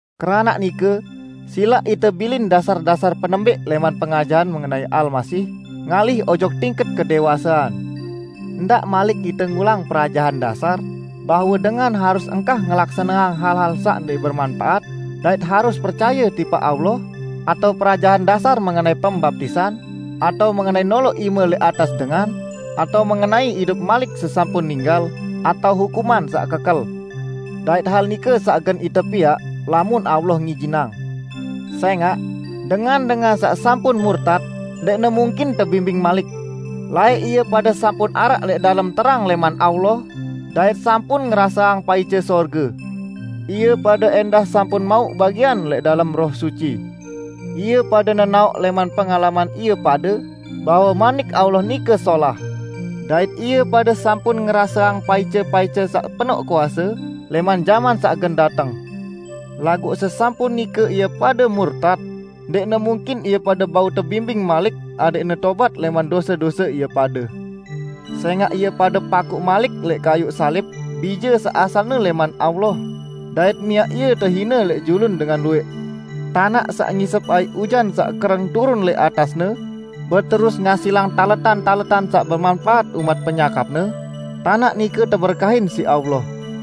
Keranaq nike silaq ite bilin dasar-dasar penembẽq lẽman pengajahan mengenai Almasih ngalih ojok tingket kedẽwasean. Ndaq malik ite ngulang perajahan dasar bahwe dengan harus engkah ngelaksaneang hal-hal saq ndẽq bemanpaat, dait harus percaye tipaq Allah, atao perajahan dasar mengenai pembaptisan, atao mengenai noloq ime lẽq atas dengan, atao mengenai idup malik sesampun ninggal atao hukuman saq kekel. Dait hal nike saq gen ite piaq, lamun Allah ngijinang. Sẽngaq, dengan-dengan saq sampun murtat, ndẽqne mungkin tebimbing malik. Laẽq ie pade sampun araq lẽq dalem terang lẽman Allah, dait sampun ngeraseang paice sorge. Ie pade ẽndah sampun mauq bagian lẽq dalem Roh Suci. Ie pade nenaoq lẽman pengalaman ie pade bahwe Manik Allah nike solah, dait ie pade sampun ngeraseang paice-paice saq penoq kuase lẽman jaman saq gen dateng. Laguq sesampun nike ie pade murtat, ndẽqne mungkin ie pade bau tebimbing malik adẽqne tobat lẽman dose-dose ie pade. Sẽngaq ie pade pakuq malik lẽq kayuq salib Bije saq asalne lẽman Allah dait miaq Ie tehine lẽq julun dengan luwẽq. Tanaq saq ngisep aiq ujan saq kereng turun lẽq atasne, beterus ngasilang taletan-taletan saq bemanpaat umaq penyakapne, tanaq nike teberkahin siq Allah.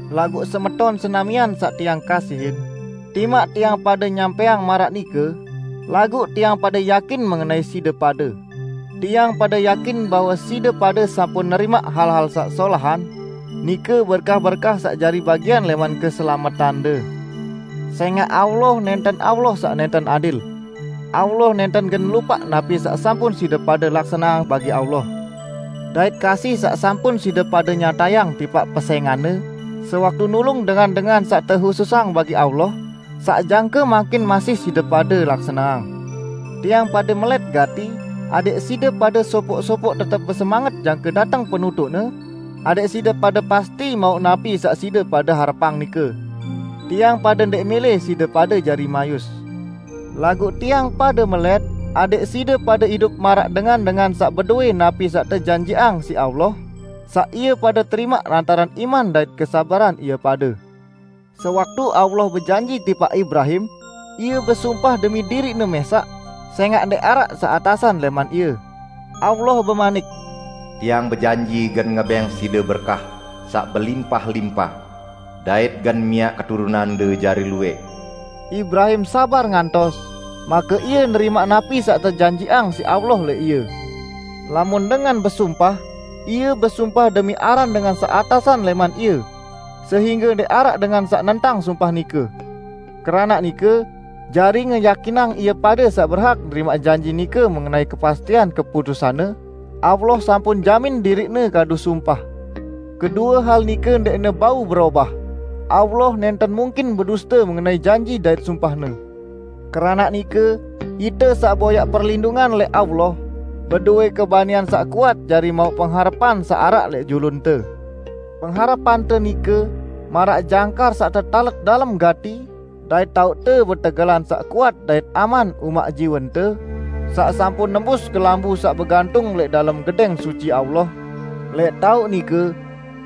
Laguq semeton senamian saq tiang kasihin, timaq tiang pade nyampẽang maraq nike, laguq tiang pade yakin mengenai side pade. Tiang pade yakin bahwe side pade sampun nerimaq hal-hal saq solahan, nike berkah-berkah saq jari bagian lẽman keselametande. Sẽngaq Allah nẽnten Allah saq nẽnten adil. Allah nẽnten gen lupaq napi saq sampun side pade laksaneang bagi Allah, dait kasih saq sampun side pade nyatayang tipaq pesẽngan-Ne sewaktu nulung dengan-dengan saq tehususang bagi Allah saq jangke mangkin masih side pade laksaneang. Tiang pade melẽt gati adẽq side pade sopoq-sopoq tetep besemanget jangke dateng penutuqne, adẽq side pade pasti mauq napi saq side pade harepang nike. Tiang pade ndẽq mẽlẽ side pade jari mayus. Laguq tiang pade melẽt adẽq side pade idup maraq dengan-dengan saq bedowẽ napi saq tejanjiqang siq Allah, saq ie pade terimaq lantaran iman dait kesabaran ie pade. Sewaktu Allah bejanji tipaq Ibrahim, Ie besumpah demi diriq-Ne mẽsaq, sẽngaq ndẽq araq saq atasan lẽman Ie. Allah bemanik, "Tiang bejanji gen ngebẽng side berkah saq belimpah-limpah dait gen miaq keturunande jari luwẽq." Ibrahim sabar ngantos, make ie nerimaq napi saq tejanjiqang siq Allah lẽq ie. Lamun dengan besumpah, ie besumpah demi aran dengan saq atasan lẽman ie, sehingge ndẽq araq dengan saq nentang sumpah nike. Keranaq nike, jari ngeyakinang ie pade saq berhak nerimaq janji nike mengenai kepastian keputusan-Ne, Allah sampun jamin diriq-Ne kadu sumpah. Kedue hal nike ndẽqne bau berobah: Allah nẽnten mungkin beduste mengenai janji dait sumpah-Ne. Keranaq nike, ite saq boyaq perlindungan lẽq Allah, bedowẽ kebanian saq kuat jari mauq pengharepan saq araq lẽq julunte. Pengharepante nike maraq jangkar saq tetalet dalem gati dait taoqte betegelan saq kuat dait aman umaq jiwente, saq sampun nembus kelambu saq begantung lẽq dalem Gedẽng Suci Allah, lẽq taoq nike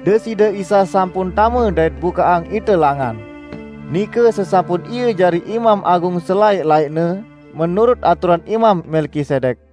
Deside Isa sampun tame dait bukaqang ite langan, nike sesampun Ie jari Imam Agung selaẽq-laẽqne, menurut aturan Imam Melkisedek.